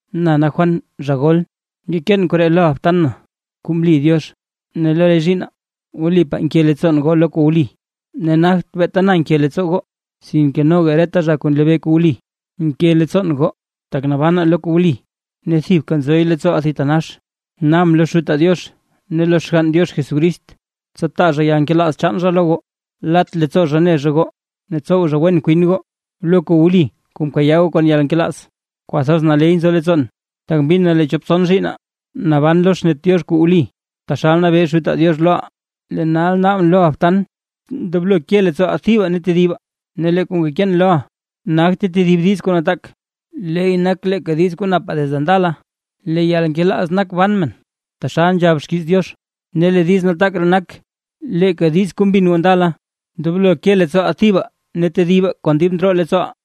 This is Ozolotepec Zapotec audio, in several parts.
Na Juan, zha gol. Ngekeen koree loʼa btan na kuu mli Diox ne lo re zhiinna, wlipaa nke leettsoon goo lo kuu wli, ne nagt beeta na nke leettsoo goo, sinke noga reta zha kuu nlebee kuu wli. Nke leettsoon goo, tak nabanaa lo kuu wli ne thibka nzoy leettsooʼaa thitanax. Naabʼn lo Xutaa Diox ne lo Xgann Diox Jesucrist, tsa taa zha yalnkelaaz chaan zha lo goo, lat leettsoo zha ne zha goo, ne tsow zha wen kwin goo, lo kuu wli kuu mkayaa goo kon yalnkelaaz. Kwathoz naley nzo leettsoon, tak mbin na lee chop tson zhiinna naban lo xnet Diox kuu wli, taxal mnabee Xutaa Diox loʼaa. Lee nal naabʼn loʼa btan, ndoblo ke leettsooʼaa thibaa ne tedibaa. Ne lee kuu ngekeen loʼa nagte tedib diiz kub kuu nataak, leey nak leeka diiz kuu napaa desde ndala. Lee yalnkelaaz nak ban men taxal nzhab xkiiz Diox; ne lee diiz nataak ree nak leeka diiz kuu mbin goo ndala: “Ndoblo ke leettsooʼaa thibaa ne tedibaa kon dib ndroo leettsooʼaa”.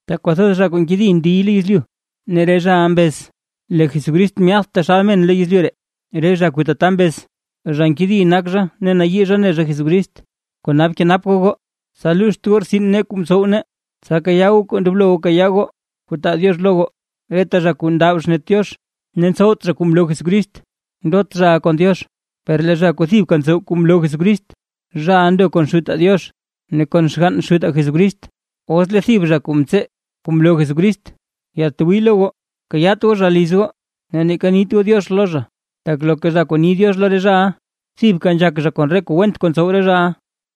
Tak kwathoz zha kuu nkedi ndiy dib lo yezlyu, ne re zhaʼa mbez: “Lee Jesucrist myaadt taxal men lo yezlyu ree”. Re zha kuu tata mbez, zha nkedi nak zha ne nayii zha ne zha Jesucrist. Kona bkenap goo goo, tsa luuxt goo rtsin nee kuu mtsow nee, tsa kayaa goo kuu ndoblo goo kayaa goo kuu taa Diox lo goo. Reta zha kuu ndab xnet Diox ne ntsowt zha kuu mloo Jesucrist, ndot zhaʼa kon Diox; per lee zha kuu thibka ntsow kuu mloo Jesucrist, zhaʼa ndo kon Xutaa Diox ne kon xgann Xutaa Jesucrist. Os lee thib zha kuu ntsee kuu mloo Jesucrist yatwii lo goo, kayaat goo zha liz goo ne neeka nit goo “diox” lo zha, tak loka zha kuu ni “diox” lo re zhaʼa, thibka nzhak zha kon re kuu went kuu ntsow re zhaʼa.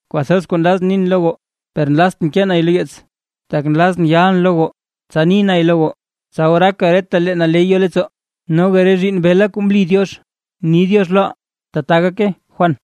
Kwathoz kuu nlazʼn nin lo goo, per nlaztʼn kee nay lo yeets; tak nlazʼn yalʼn lo goo tsa ni nay lo goo, tsa oraaka retalee naley yo leettsoo. Noga re zhiinn bela kuu mli Diox, ni “diox” loʼa. ¡Tbaa gake! Juan